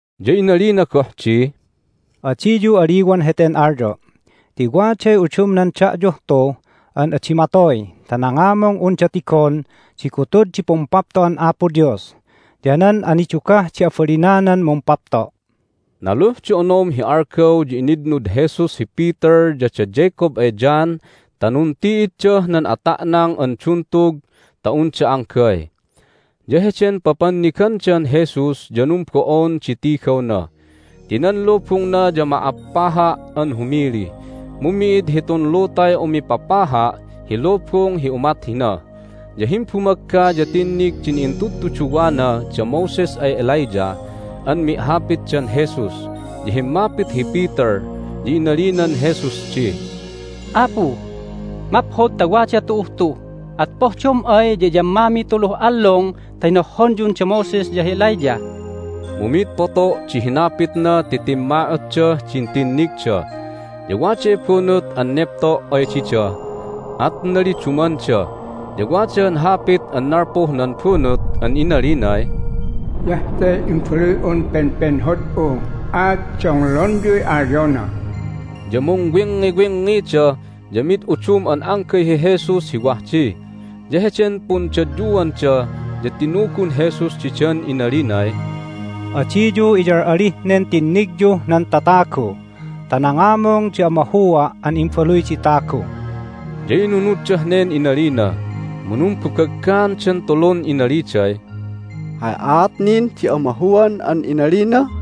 Ya inalina goh di, "Adiyu aliwan heten alyo'! Ti waday udumnan da'yuh tu an adi matoy ta nangamung unda tigon di gutud di Pumpapto'an Apo Dios ya nan anidugah di abalinanan mumpapto'." Naluh di onom hi algaw ya initnud Jesus hi Peter ya da Jacob ay John ta nunti'iddah nan ata'nang an duntug ta unda anggay. Ya heden papannigandan Jesus ya numbo'on di tigawna ti nan lubungna ya ma'appaha' an humili, mu mi'id hitun lutay umipapaha' hi lubung hi umat hina. Ya himbumagga ya tinnig din intudtuduwana da Moses ay Elijah an mi'hapitdan Jesus. Ya himmapit hi Peter, ya inalinan Jesus di, "Apu, maphod ta wada tu'uh tu! At pohdom ay ya iyammamiy tuluh allung ta hinohhonyun da Moses ya hi Elijah!" Mu mid poto' di hinapitna ti timma'otdah din tinnigda. Ya waday bunut an nepto' ay dida, at nalidumanda. Ya wada han hapit an nalpuh nan bunut an inalinay, "Hiyah te Imbaluy'un pepenhod'u, at donglonyuy alyona!" Ya mungwingngiwingngida, ya mid udum an anggay hi Jesus hi wah di. Ya heden pundadyuanda ya tinugun Jesus didan inalinay, "Adiyu iyal'alih nen tinnigyuh nan tatagu ta nangamung di amahua' an Imbaluy di Tagu." Ya inunuddah nen inalina, mu numbabaggaandan tulun inaliday, "Hay aat nin di amahuan an inalina?"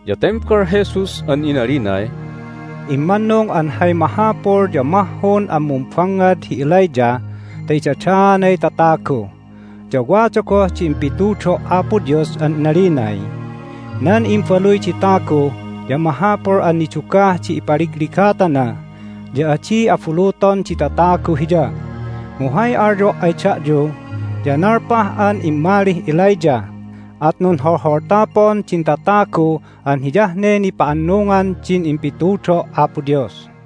Ya tembal Jesus an inalinay, "Immannung an hay mahapul ya mahhun an mumbangngad hi Elijah ta idadaanay tatagu. Ya wada goh di impitudo' Apo Dios an inalinay, Nan Imbaluy di Tagu ya mahapul an nidugah di ipaligligatana, ya adi abuluton di tatagu Hiya. Mu hay alyo' ay da'yu ya nalpah an immalih Elijah, at nunholholtapun din tatagu an hiyah ne nipa'annungan din impitudo' Apo Dios."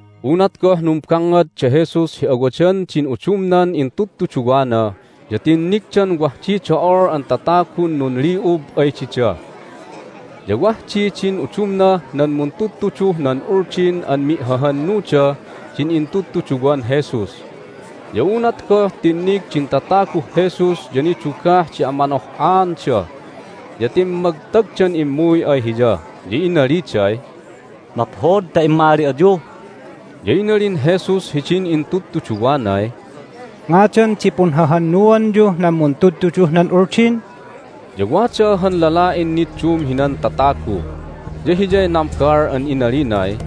Unat goh numbangngad da Jesus hi awadan din udumnan intudtuduwana ya tinnigdan wah di do'ol an tatagun nunli'ub ay dida. Ya wah di din udumnah nan muntudtuduh nan Uldin an mi'hahannudah din intudtuduwan Jesus. Ya unat goh tinnig din tataguh Jesus ya nidugah di amanoh'aanda, ya timmagtagdan immuy ay Hiya, ya inaliday, "Maphod ta immali ayu!" Ya inalin Jesus hidin intudtuduwanay, "Ngadan di punhahannuanyuh nan muntudtuduh nan Uldin?" Ya wada han lala'in niddum hinan tatagu, ya hiyay nambal an inalinay,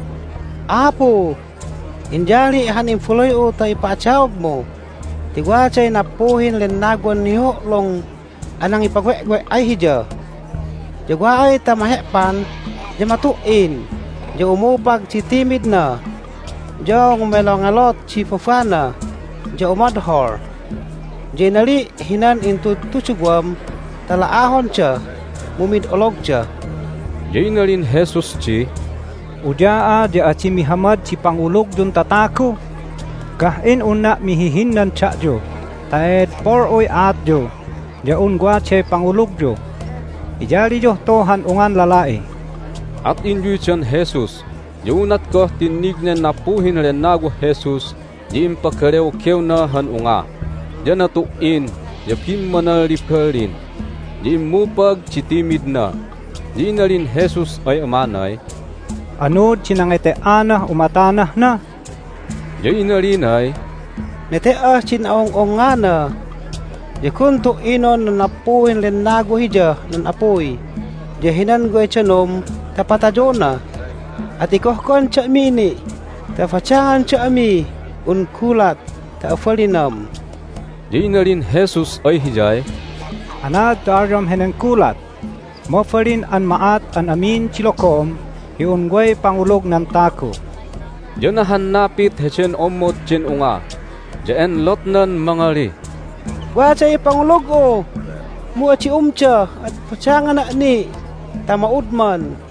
"Apu, inyali' han imbaluy'u ta ipa'adaogmu ti waday nappuhin lennawan nihuhu'lung an nangipawe'we' ay hiya. Ya wa ay ta mahe'pan ya matu"in, ya umupag di timidna, ya ngumelongelot di babana, ya umodhol. Ya inali' hinan intudtuduwam ta la'ahonda, mu mid ologda." Ya inalin Jesus di, "Uya'a ya adi mihamad di pangulugyun tatagu! Gah'in unna' mihihinnan da'yu ta e'edpol'uy aatyu ya un waday pangulugyu! Iyaliyuh tu han ungan lala'i!" At inyuydan Jesus. Ya unat goh tinnig nen nappuhin lennawah Jesus ya impagalewgewna han unga, ya natu"in, ya bimmanalliballin, ya immupag di timidna. Ya inalin Jesus ay amanay, "Anuud di nangete"anah umatanah na?" Ya inalinay, "Nete"ah din a'ung'ungngana. Ya gun tu"inon nan nappuhin lennawa hiyah nan apuy ya hinan way danum ta patayona. At igohgohan da'mi ni' ta badangan da'mih un gulat ta abalinam!" Ya inalin Jesus ay hiyay, "Anaad ta alyom henen gulat? Mabalin an ma'at an amin di logom hi un way pangulug nan tagu!" Ya nahannapit heden ommod den unga, ya enlotnan mangalih, "Waday pangulug'u, mu adi umda, at badangana' ni' ta ma'udman!"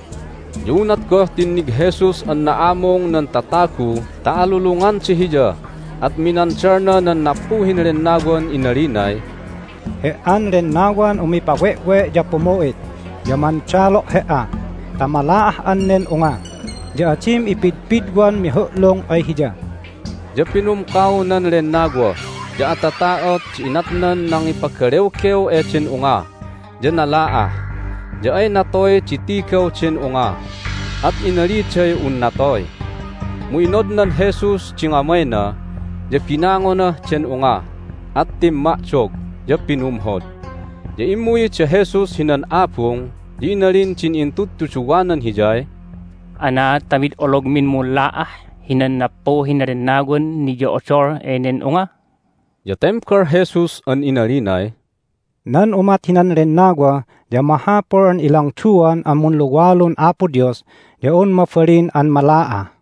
Ya unat goh tinnig Jesus an na'amung nan tatagu ta alulunganda Hiya at minandalna nan nappuhin lennawan inalinay, "He"an lennawan umipawe'we' ya pumu'it ya mandalo' he"a ta mala'ah'an nen unga, ya adim ipidpidwan mihu'lung ay hiya!" Ya pinumkaw nan lennawa, ya atata'ot di inatnan nangipagalewgew eden unga, ya nala'ah. Ya ay natoy di tigaw den unga, at inaliday un natoy! Mu inodnan Jesus di ngamayna, ya binangonah den unga, at timma'dog, ya pinumhod. Ya immuy da Jesus hinan abung, ya inalin din intudtuduwanan Hiyay, "Anaad ta mid ologmin munla'ah hinan nappuhin lennawan niyo'odol enen unga?" Ya tembal Jesus an inalinay, "Nan umat hinan lennawa ya mahapul an ilangduan an munluwalun Apo Dios ya un mabalin an mala'ah."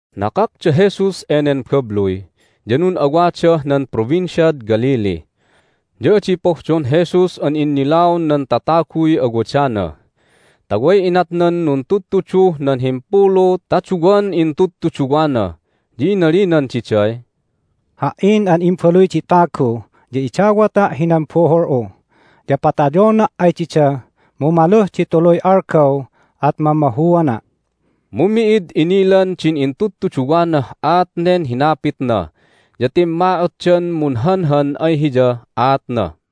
Nakak da Jesus enen babluy, ya nun'awadah nan Provinciad Galilee. Ya adi pohdon Jesus an innilaon nan tataguy awadana ta way inatnan nuntudtuduh nan himpulu ta duwan intudtuduwana. Ya inalinan diday, "Ha"in an Imbaluy di Tagu ya idawata' hinan buhul'u. Ya patayona' ay dida, mu maluh di tuluy algaw at mamahuana'." Mu mi'id inilan din intudtuduwanah aat nen hinapitna, ya timma'otdan munhanhan ay Hiyah aatna.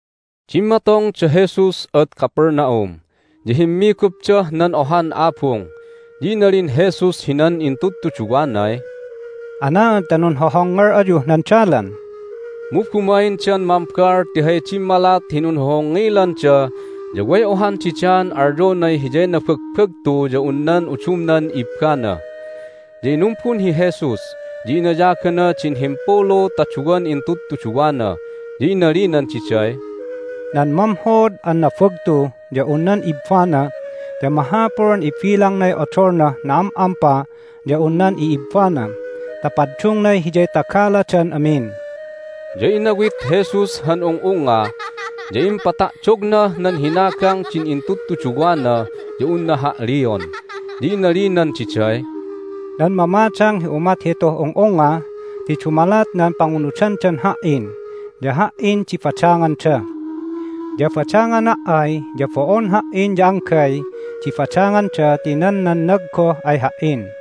Dimmatong da Jesus ad Capernaum, ya himmigupdah nan ohan abung. Ya inalin Jesus hinan intudtuduwanay, "Anaad ta nunhohongngel ayuh nan dalan?" Mu bumaindan mambal ti hay dimmalat hi nunhohongngilanda ya way ohan didaan alyonay hiyay nabagbagtu ya un nan udumnan ibbana. Ya inumbun hi Jesus, ya inayagana din himpulu ta duwan intudtuduwana, ya inalinan diday, "Nan mamhod an nabagtu ya un nan ibbana ya mahapul an ibilangnay odolnah na'am'ampa ya un nan i'ibbana ta paddungnay hiyay tagaladan amin." Ya inawit Jesus han ung'ungnga, ya impata'dognah nan hinagang din intudtuduwana ya unna ha'lion, ya inalinan diday, "Nan mamadang hi umat hituh ung'ungnga ti dumalat nan pangunudandan Ha"in ya Ha"in di badanganda. Ya badangana' ay ya bo'on Ha"in ya anggay di badanganda ti nan nannag goh ay Ha"in."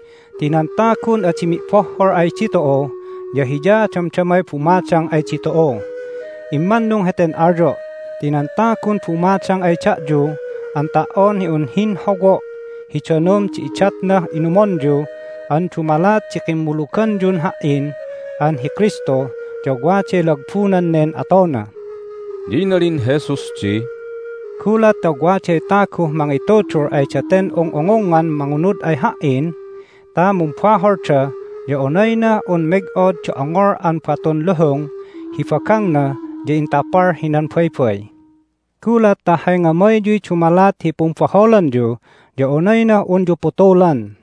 Ti nan tagun adi mi'bohhol ay ditu'u ya hiya damdamay bumadang ay ditu'u. Immannung heten alyo' ti nan tagun bumadang ay da'yu an ta"on hi un hinhowo' hi danum di idatnah inumonyu an dumalat di kimmuluganyun Ha"in an hi Kristu ya waday lagbunan nen atona." Ya inalin Jesus di, "Gulat ta waday taguh mangitudul ay daten ung'ungungngan mangunud ay Ha"in ta mumbaholda ya onaynah un meg'od di ongol an batun luhung hi bagangna ya intapal hinan baybay. Gulat ta hay ngamayyuy dumalat hi pumbaholanyu ya onaynah unyu putulan.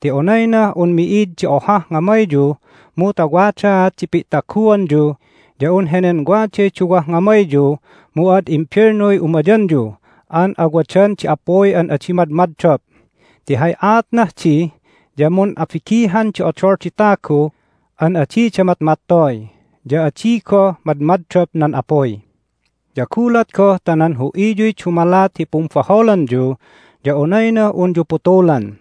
Ti onaynah un mi'id di ohah ngamayyu mu ta wadaat di pi'taguanyu ya un henen waday duwah ngamayyu, mu ad imbelnuy umayanyu an awadan di apuy an adi madmaddop. Ti hay aatnah di ya mun'abigihan di odol di tagu an adida matmattoy, ya adi goh madmaddop nan apuy. Ya gulat goh ta nan hu'iyuy dumalat hi pumbaholanyu ya onaynah unyu putulan.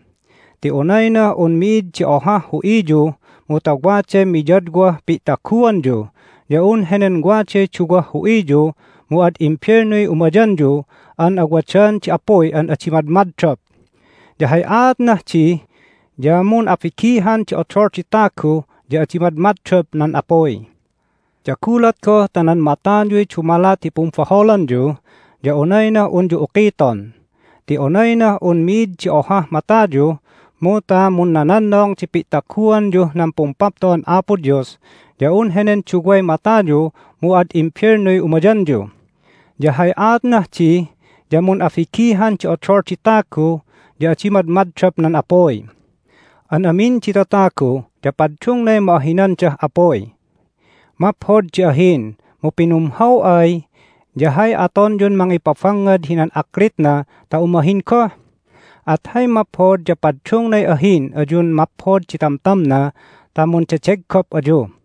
Ti onaynah un mi'id di ohah hu'iyu mu ta waday miyadwah pi'taguanyu ya un henen waday duwah hu'iyu mu ad imbelnuy umayanyu an awadan di apuy an adi madmaddop. Ya hay aatnah di ya mun'abigihan di odol di tagu ya adi madmaddop nan apuy. Ya gulat goh ta nan matayuy dumalat hi pumbaholanyu ya onaynah unyu ukiton. Ti onaynah un mi'id di ohah matayu mu ta munnanannong di pi'taguanyuh nan pumpapto'an Apo Dios ya un henen duway matayu mu ad imbelnuy umayanyu. Ya hay aatnah di ya mun'abigihan di odol di tagu ya adi madmaddop nan apuy. An amin di tatagu ya paddungnay ma'ahinandah apuy. Maphod di ahin, mu pinumhaw ay ya hay atonyun mangipabangngad hinan aklitna ta umahin goh? At hay maphod ya paddungnay ahin ayun maphod di tamtamna ta mundedeggop ayu."